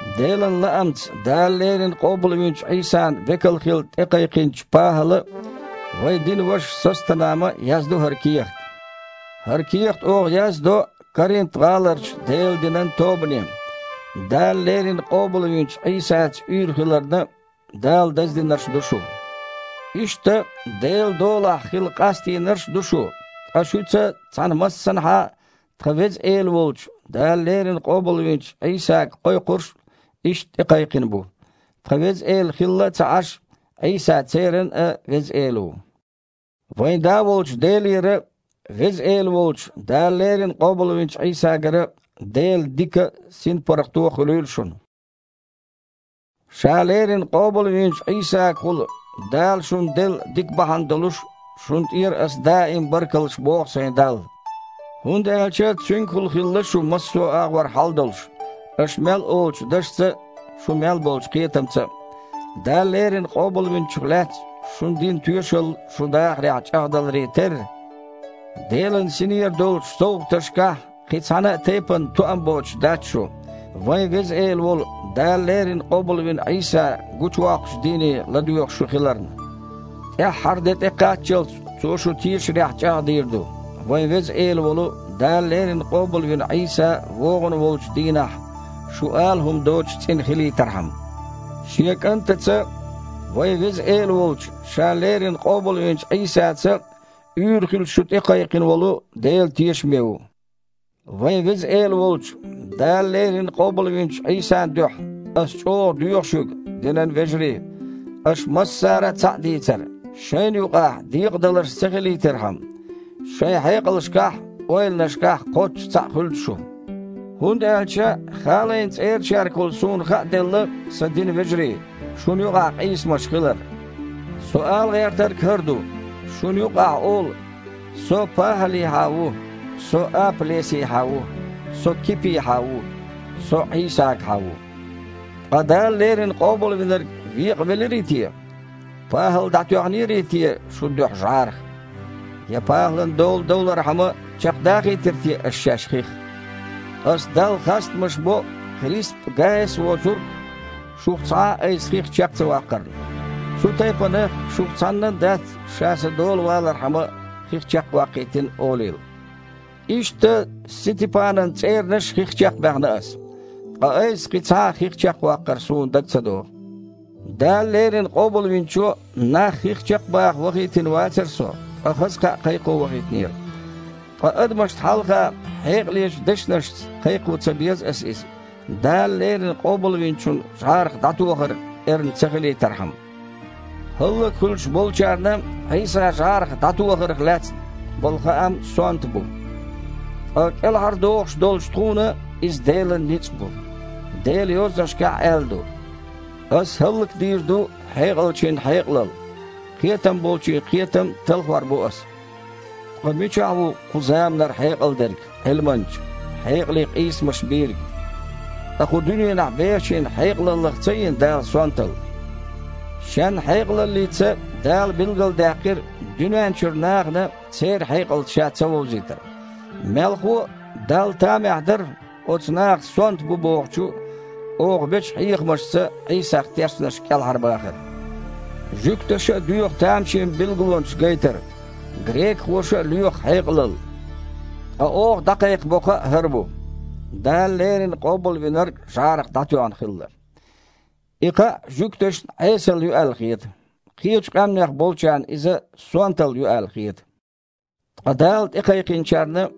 Делан лаамца Дала леррина къобалвинчу Іийсан векал хила тІекхайкхийнчу ПахІала а, вайн динан вашас Состанама а яздо хІара кехат. ХІара кехат оха яздо Коринт-гІаларчу Делан динан тобане. Дала леррина къобалвинчу Іийсаца уьйр хиларна, Дала даздинарш ду шу. Иштта, Делан долахь хила къастийнарш а ду шу, ткъа шуьца цхьаьна массанхьа а тхан Веза Эла волчу, Дала леррина къобалвинчу Іийсага кхойкхурш а иштта тІекхайкхина бу. Тхан Веза Эла хилла а ца Іаш, Іийса церан а Веза Эла ву. Вайн Да волчу Делера а, Веза Эла волчу, Дала леррина къобалвинчу Іийсагара а Делан дика а, синпаргІато а хуьлийла шуна. Ша леррина къобалвинчу Іийсагахула Дала шуна делла дика бахьана долуш, шуна тІера ас даим а баркаллаш боху сайн Далла. ХІунда аьлча Цуьнгахула хилла шу массо а агІор хьал долуш – аша мел олучу дашца а, шун мел болчу кхетамца а. Дала леррина Къобалвинчух лаьцна шуна дина тоьшалла шун дахарехь чІагІдаларе терра, Делан Синера долчу совгІаташкахь кхин цхьана а тайпана тоам боцуш дац шу, вайн Веза Эла волу, Дала леррина къобалвина Іийса гучувоккхучу дийне ладоьгІуш шу хиларна. ТІаьххьара де тІекхаччалц Цо шу тешарехь чІагІдийр ду, вайн Веза Эла волу, Дала леррина къобалвина Іийса вогІун волчу дийнахь шу ала хІума доцуш цІена хилийтархьама. Шен КІантаца, вайн Веза Эла волчу, Ша леррина къобалвинчу Іийсаца, уьйр хила шу тІекхайкхина волу Дела тешаме ву. Вайн Веза Эла волчу, Дала леррина къобалвинчу Іийсан дуьхьа ас чІогІа доьху шуьга, динан вежарий, аша массара а цхьаъ дийцар, шайна юкъахь декъадаларш ца хилийтархьама. Шайн хьекъалшкахь а, ойланашкахь а кхоччуш цхьаъ хуьлда шу. ХІунда аьлча Халайн цІерачаьргахула суна хааделла, сан динан вежарий, шуна юкъахь къийсамаш хилар. Со ала гІертарг хІара ду: шуна юкъахь олу: «Со – ПахІалехьа ву», «Со – Апа-Лесехьа ву», «Со – Кипехьа ву», «Со – Іийсагахьа ву». Ткъа Дала леррина Къобалвинарг векъавелирий те? ПахІал дІатоьхнерий те шун дуьхьа жІарах? Я ПахІалан дола довлархьама чекхдахийтира те аша шаьш хих? Аса Далла хастамаш бо, Крисп а, Гаяс а воцург, шух цхьа а айса хих чекх ца ваккхарна. Цу тайпана, шух цхьаннан а дац ша сан дола валархьама хих чекхваккхийтина олийла. (Иштта Сетипанан цІеранаш а хих чекхбаьхна ас. Ткъа айса кхин цхьа а хих чекхваккхар суна дага ца догІу.) Дала леррина Къобалвинчо нах хих чекхбаха вахийтина вацара со, ткъа хаза кхаъ кхайкхо вахийтинера. Ткъа адамашна хьалха хьекъалечу дешнашца кхайкхо ца беза аса иза, Дала леррина Къобалвинчун жІарах дІатохар эрна ца хилийтархьама. ХІаллакьхуьлуш болчарна Іийса жІарах дІатохарх лаьцна болу хаам сонта бу. Ткъа кІелхьардохуш долчу тхуна – иза Делан ницкъ бу. Делан Йозанашкахь аьлла ду: «Аса хІаллакдийр ду хьекъалчийн хьекъалалла, кхетам болчийн кхетам а талхор бу аса». Ткъа мичахь ву кху заманара хьекъал дерг, Іилманча, хьекъале къийсамаш бийриг? Ткъа кху дуьненахь бехачийн хьекъалаллах ца йина Дала сонталла? Шен хьекъалаллица Дала билгалдаьккхира дуьнен чуьра нахана церан хьекъалца Ша цавовзийтар. Мелхо а, Далла тамехь дара, оцу наха «сонта» бу бохучу, оха бечу хьехамашца Іийсах тешнарш кІелхьарбахар. Жуьгташа а доьху тамашийна билгалонаш гайтар, грекахоша а лоьху хьекъалалла, ткъа оха дІакхайкхабо кхаъ хІара бу: Дала леррина Къобалвинарг жІарах дІатоьхна хилла. И кхаъ жуьгташна Іесалла ю аьлла хета, кхечу къаьмнех болчарна иза «сонталла» ю аьлла хета, ткъа Дала тІекхайкхинчарна,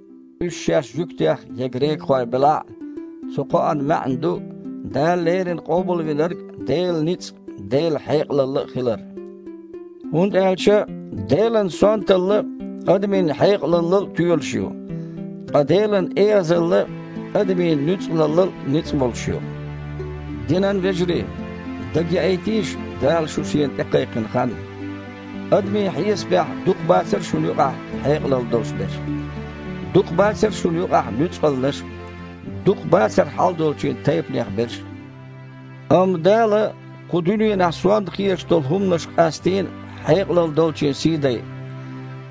уьш шаьш жуьгтех я грекахойх белахь а, цу кхоан маьІна ду, Дала леррина Къобалвинарг Делан ницкъ а, Делан хьекъалалла а хилар. ХІунда аьлча Делан «сонталла» адамийн хьекъалаллал а тоьлуш ю. Ткъа Делан «эгІазалла» адамийн нуьцкъалаллал а ницкъ болуш ю. Динан вежарий, дагаяийтийша Дала шу Шена тІекхайкхина хан. Адамийн хьесапехь дукха бацара шуна юкъахь хьекъалалла долуш берш. Дукха бацара шуна юкъахь нуьцкъалнаш а, дукха бацара хьалдолчийн тайпанех берш а. Амма Дала кху дуьненахь сонта хеташ долу хІуманаш къастийна хьекъалалла долчийн сий дайа,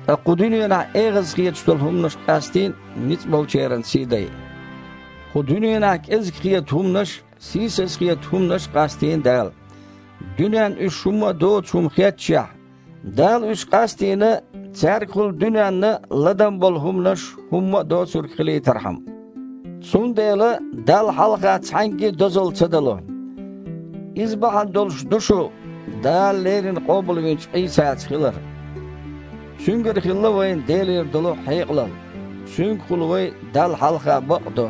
ткъа кху дуьненахь эгІаза хеташ долу хІуманаш къастийна ницкъболчеран сий дайа. Кху дуьненахь кІезиг хета хІуманаш а, сийсаза хета хІуманаш а къастийна Дала. Дуьненна уьш хІумма а доцу хІума хетташехь, Дала уьш къастийна, цаьргахула дуьненна ладам болу хІуманаш хІумма а доцург хилийтархьама. Цундела Далла хьалха цхьаьнгге а дозалла ца дало. Иза бахьана долуш ду шу Дала леррина къобалвинчу Іийсаца хилар! Цуьнгара хилла вайна Делера долу хьекъалалла. Цуьнгахула вай Далла хьалха бакъ а до,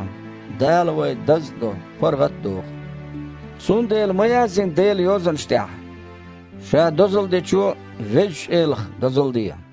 Дала вай даз а до, паргІат а доху. Цундела ма яздина Делан Йозанаш тІехь: «Ша дозалла дечо – Везачу Элах дозалла де».